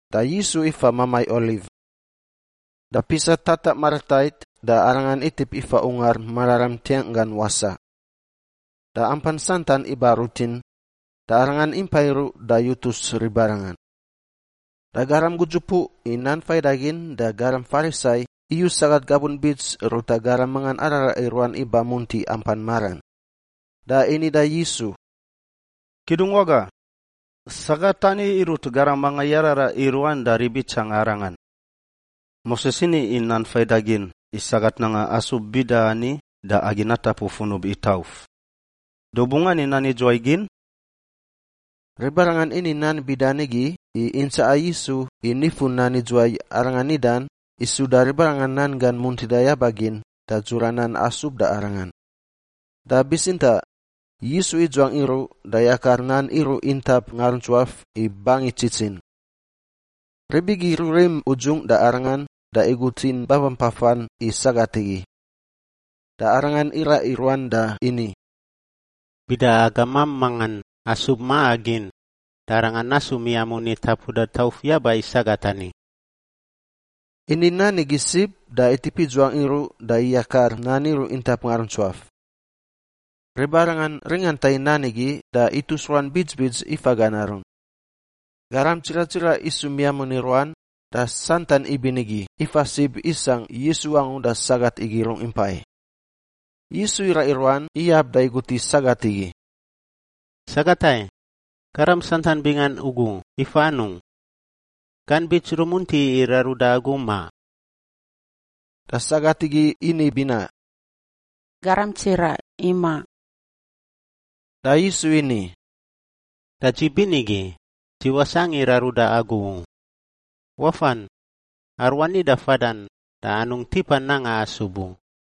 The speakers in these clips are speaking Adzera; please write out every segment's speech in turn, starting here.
Da Yisu ifa mamai Oliv. Da pisa tataꞌ maratait da Arangan itip ifa Ungar Mararam ntiangꞌ gan wasaꞌ. Da ampan santan iba rutin, da Arangan impai iruꞌ da yutus ribarangan. Da garam gudzupuꞌ i nan faidagin da garam Farisai iyu sagat gabun bits ruta garam mangan araraꞌa i ruan iba munti ampan maran da ini da Yisu, “Kidungwaga, sagat ani irut garam mangan yararaꞌ i ruan da rib itsangan arangan. Moses ini i Nan Faidagin i sagat nanga asub bida ani da agi natapu funub i tauf. Da u bungꞌ ani nan idzuwai gin?” Ribarangan ini nan bida nigi i intsaꞌa Yisu i nifu nan idzuwai Arangan nidan i suda ribarangan nan gan muntida yaba gin da dzura nan asub da Arangan. Da bitsintaꞌ Yisu idzuangꞌ iruꞌ da yakar nan iruꞌ intap ngaruntsuaf i bangi tsitsin. Rib igi rurim udzungꞌ da Arangan da igutin babampafan i sagat igi. Da Arangan iraꞌ i ruan da ini, “Bida agamam mangan asub maꞌa gin, da arangan nasu miamun i tapuda tauf yaba i sagat ani!” Ini nan igi sib da itip idzuangꞌ iruꞌ da ikakar nan iruꞌ intap ngaruntsuaf. Ribarangan ringanta i nan igi da itus ruan bits bits ifa gan arun. Garam tsiraꞌ tsiraꞌ isu miamun i ruan da santan ibinigi ifa sib isangꞌ Yisu angu da sagat igi rungꞌ impai. Yisu iraꞌ i ruan iyab da igut i sagat igi, “Sagat ai, garam santan bingan ugu ifa anungꞌ? Gan bits rumunti i raruda agu, ma?” Da sagat igi ini binaꞌ, “Garam tsiraꞌ, imaꞌ.” Da Yisu ini, “Da dzi binigi, dzi wasangꞌ i raruda agu u. Wafan. Aruani da fadan da anungꞌ tipa nanga asub u.”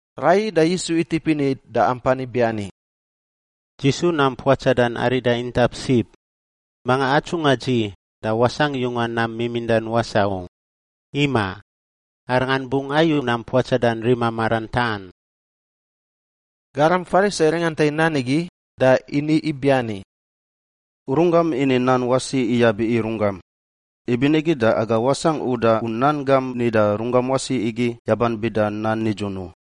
Raiyi da Yisu itip ini da ampan ibiani, “Dzi su nam puatsadan arida intap sib. Manga atsungꞌa dzi da wasangꞌ yunga nam mimindan wasaꞌ u. Imaꞌ, arangan bungꞌ ayu nam puatsadan rima maran taꞌan.” Garam Farisai ringanta i nan igi da ini ibiani, “U runggam ini nan wasi iyab i runggam, ibinigi da aga wasangꞌ uda u nan gam nida runggam wasi igi yaban bida nan nidzun u.”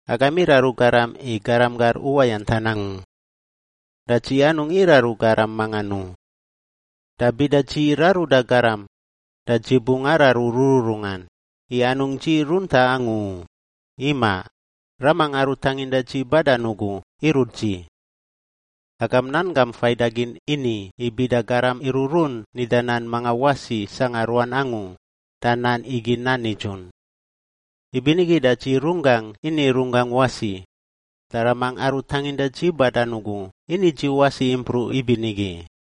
Agam iraru garam i garam gar uwayantan angu. Da dzi anungꞌ iraru garam mangan u. Da bida dzi raruda garam, da dzi bungꞌ araru rururungan, i anungꞌ dzi runtaꞌ angu u; imaꞌ, Ramangꞌ aru tanginda dzi badan ugu irut dzi. Agam Nan Gam Faidagin ini i bida garam iruꞌrun nida nan mangan wasi sangꞌa ruan angu da nan igi nan nidzun. Ibinigi da dzi runggangꞌ ini runggangꞌ wasi, da Ramangꞌ aru tanginda dzi badan ugu ini dzi wasi impruꞌ ibinigi.”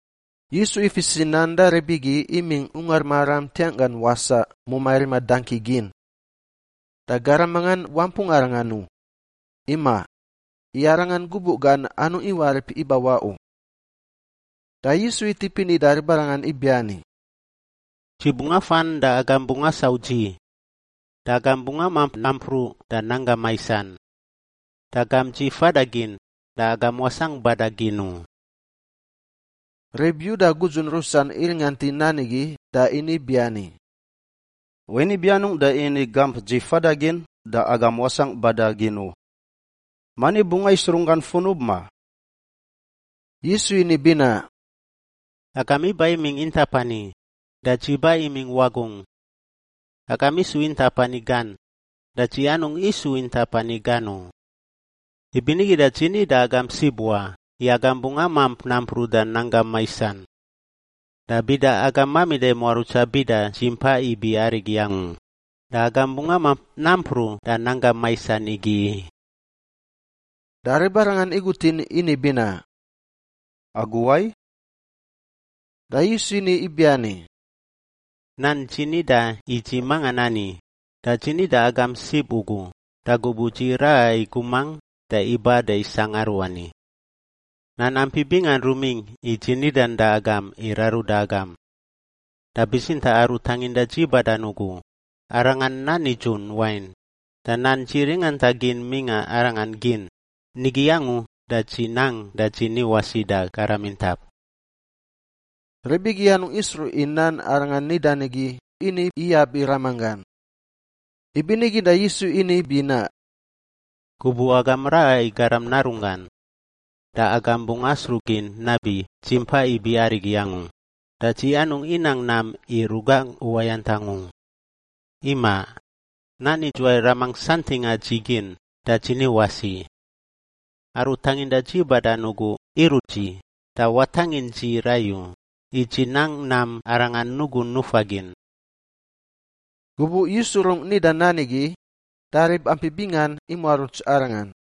Yisu ifis i nan da rib igi imingꞌ Ungar Mararam ntiangꞌ gan wasaꞌ mumai rima dangki gin. Da garam mangan wampung Arangan u; imaꞌ, i Arangan gubuꞌ gan anungꞌ iwarip ibawaꞌ u. Da Yisu itip ini da ribarangan ibiani, “Dzi bungꞌ afan da agam bungꞌ asau dzi, da agam bungꞌ amamp nampruꞌ da nanggam maisan. Da gamp dzi fada gin da agam wasangꞌ bada gin u.” Rib Yuda gudzun rusan iringant i nan igi da ini ibiani, “Wain ibi anungꞌ da ini, ‘Gamp dzi fada gin da agam wasangꞌ bada gin u’? Mani bungꞌ ais runggan funub, ma?” Yisu ini binaꞌ, “Agam iba imingꞌ intap ani, da dzi ba imingꞌ wagungꞌ. Agam isu intap ani gan, da dzi anungꞌ isu intap ani gan u. Ibinigi da dzi ni da agam sib wa i agam bungꞌ amamp nampruꞌ da gam nanggam maisan. Da bida agam mamida i muarutsa bida Dzi Mpa Ibi Arigi Angu, da agam bungꞌ amamp nampruꞌ da nanggam maisan igi i.” Da ribarangan igutin ini binaꞌ, “Agu wai?” Da Yisu ini ibiani, “Nan dzi nida i dzi mangan ani, da dzi ni da agam sib ugu da gubuꞌ dzi raꞌa i gumangꞌ da iba da isangꞌ aruani. Nan ampi bingan rumingꞌ i dzi nidan da agam i raruda agam. Da bitsintaꞌ Aru tanginda dzi badan ugu, Arangan nan nidzun wain, da nan dzi ringanta gin mingꞌa Arangan gin, nigi angu da dzi nang da dzi ni wasi da garam intap.” Rib igi anungꞌ isruꞌ i nan Arangan nidan igi ini iyab i Ramanggan. Ibinigi da Yisu ini binaꞌ, “Gubuꞌ agam raꞌa i Garam Narunggan, da agam bungꞌ asruꞌ gin nabi Dzi Mpa Ibi Arigi Angu, da dzi anungꞌ inang nam i rugangꞌ uwayantangꞌ u. Imaꞌ, nan idzuwai Ramangꞌ santingꞌa dzi gin, da dzi ni wasi. Aru tanginda dzi badan ugu irut dzi da watangin dzi rai u, i dzi nang nam Arangan nugun nufa gin.” Gubuꞌ Yisu rungꞌ nida nan igi, da rib ampi bingan imuaruts Arangan.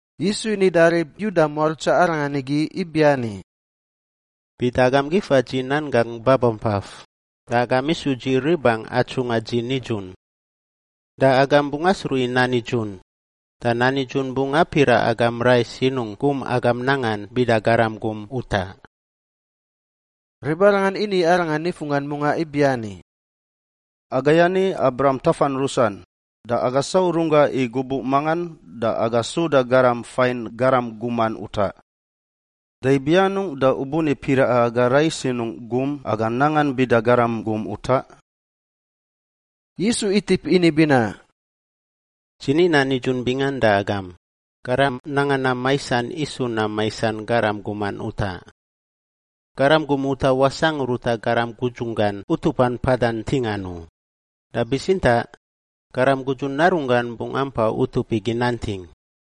Yisu ini da rib Yuda muarutsa Arangan igi ibiani, “Bida agam gifa dzi nan gangꞌ babampaf, da agam isu dzi ribangꞌ atsungꞌa dzi nidzun. Da agam bungꞌ asruꞌ i nan nidzun, da nan nidzun bungꞌ apiraꞌ agam rai sinungꞌ gum agam nangan bida garam gum utaꞌ.” Ribarangan ini Arangan nifunggan mungaꞌ ibiani, “Agai ani Abraham tafan rusan da aga sau runggangꞌ i gubuꞌ mangan da aga suda garam fain garam guman utaꞌ. Da ibi anungꞌ da u buni piraꞌa aga rai sinungꞌ gum aga nangan bida garam gum utaꞌ?” Yisu itip ini binaꞌ, “Dzi ni nan nidzun bingan da agam, garam nanga nam maisan isu nam maisan garam guman utaꞌ. Garam gum utaꞌ wasangꞌ ruta garam gudzunggan utupan mpada ntingan u, da bitsintaꞌ garam gudzun narunggan bungꞌ ampa utup igi nanting.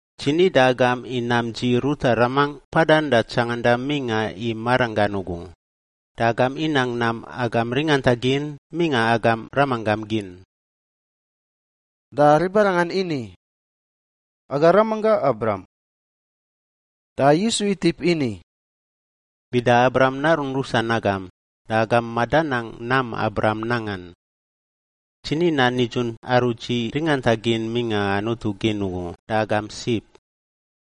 Dzi ni da agam i nam dzi ruta Ramangꞌ mpadan da tsangandan mingꞌa i maranggan ugu, da agam inang nam agam ringanta gin mingꞌa agam ramanggam gin.” Da ribarangan ini, “Aga ramanggangꞌ Abraham.” Da Yisu itip ini, “Bida Abraham narun rusan agam, da agam madanang nam Abraham nangan. Dzi ni nan nidzun aru dzi ringanta gin mingꞌa Anutu gin ugu da agam sib,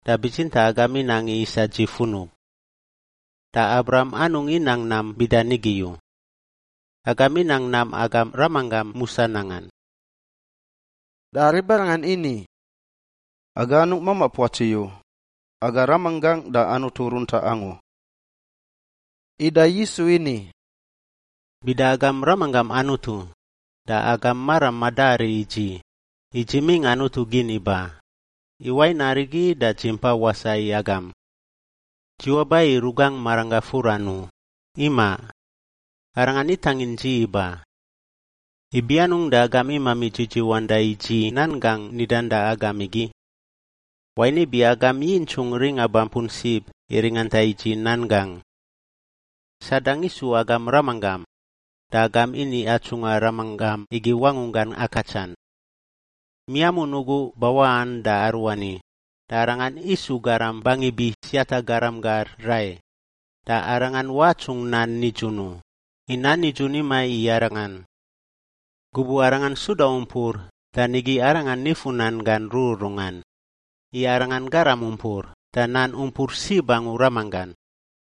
da bitsintaꞌ agam inang i isa dzi funub. Da Abraham anungꞌ inang nam bida nigi u. Agam inang nam agam ramanggam musa nangan.” Da ribarangan ini, “Aga anungꞌ mamaꞌ puatsi u; aga Ramanggangꞌ da Anutu runtaꞌ angu.” Ida Yisu ini, “Bida agam Ramanggam Anutu da agam maram madari i dzi, i dzi imingꞌ Anutu gin iba, i wain arigi da dzi mpa wasaꞌ i agam. Dzi waba i rugangꞌ maranggangꞌ furan u, imaꞌ. Arangan itangin dzi iba. Ibi anungꞌ da agam imami dzidziwanda i dzi nan gangꞌ nidan da agam igi? Wain ibi agam yintsungꞌ ringa bampun sib i ringanta i dzi nan gangꞌ. Sadang isu agam ramanggam da agam ini atsungꞌa ramanggam igi wangunggan akatsan. Miamun ugu bawaꞌan da aruani da arangan isu garam bangi biꞌ siata garam gar rai, da arangan watsungꞌ nan nidzun u, i nan nidzun imaꞌ i arangan. Gubuꞌ arangan suda umpur da nigi arangan nifu nan gan rururungan, i arangan garam umpur da nan umpur sib angu ramanggan.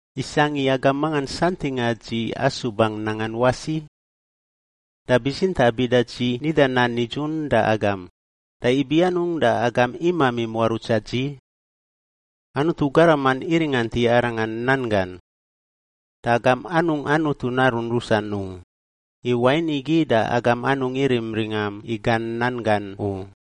Isangꞌ i agam mangan santingꞌa dzi asubangꞌ nangan wasi? Da bitsintaꞌ bida dzi nida nan nidzun da agam, da ibi anungꞌ da agam imami muarutsa dzi? Anutu garaman iringant i Arangan nan gan. Da agam anungꞌ Anutu narun rusan u, i wain igi da agam anungꞌ irim ringam i gan nan gan u.”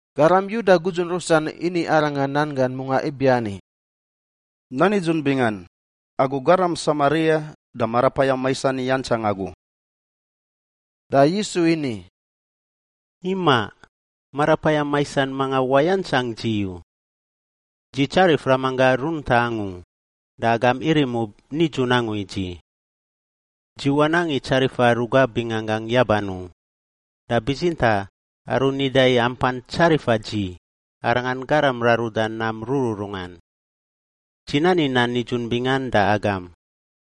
Garam Yuda gudzun rusan ini Arangan nan gan mungaꞌ ibiani, “Nan nidzun bingan! Agu garam Samaria da marapayam maisan iyantsang agu!” Da Yisu ini, “Imaꞌ! Marapayam maisan mangan wayantsang dzi u. Dzi tsarif Ramanggangꞌ runtaꞌ angu da agam irim ub nidzun angu i dzi. Dzi wanang i tsarifa rugaꞌ binganggangꞌ yaban u, da bitsintaꞌ aru nida i ampan tsarifa dzi, Arangan garam raruda nam rururungan. Dzi nani nan nidzun bingan da agam,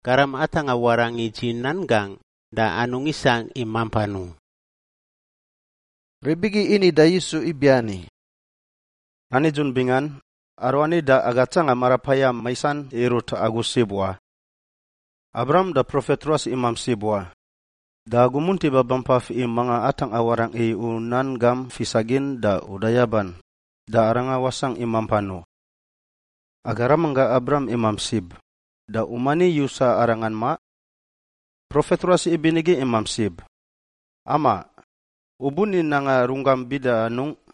garam atangꞌa warangꞌ i dzi nan gangꞌ da anungꞌ isangꞌ i mampan u.” Rib igi ini da Yisu ibiani, “Nan nidzun bingan, aruani da aga tsanga marapayam maisan irut agu sib wa! Abraham da profet ruas imamp sib wa, da agu munti babampaf i manga atangꞌa warangꞌ i u nan gam fisagin da uda yaban, da arangan wasangꞌ i mampan u. Aga ramanggangꞌ Abraham imamp sib, da u mani yusa arangan, ma? Profet ruas ibinigi imamp sib. Amaꞌ! U buni nanga runggam bida anungꞌ?”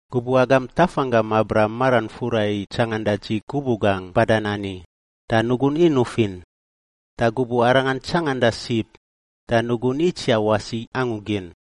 Gubuꞌ agam tafanggam Abraham maran fura i tsanganda dzi gubuꞌ gangꞌ badan ani, da nugun inuf in, da gubuꞌ arangan tsanganda sib da nugun itsiaꞌ wasi angu gin.”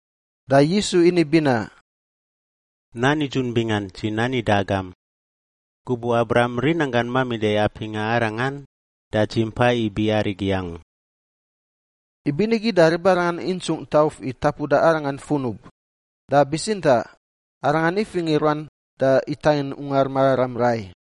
Da Yisu ini binaꞌ, “Nan nidzun bingan dzi nani da agam! Gubuꞌ Abraham rinanggan mamida i apingꞌa arangan da Dzi Mpa Ibi Arigi Angu.” Ibinigi da ribarangan intsungꞌ tauf i tapuda Arangan funub, da bitsintaꞌ Arangan ifingꞌ i ruan da itangin Ungar Mararam rai.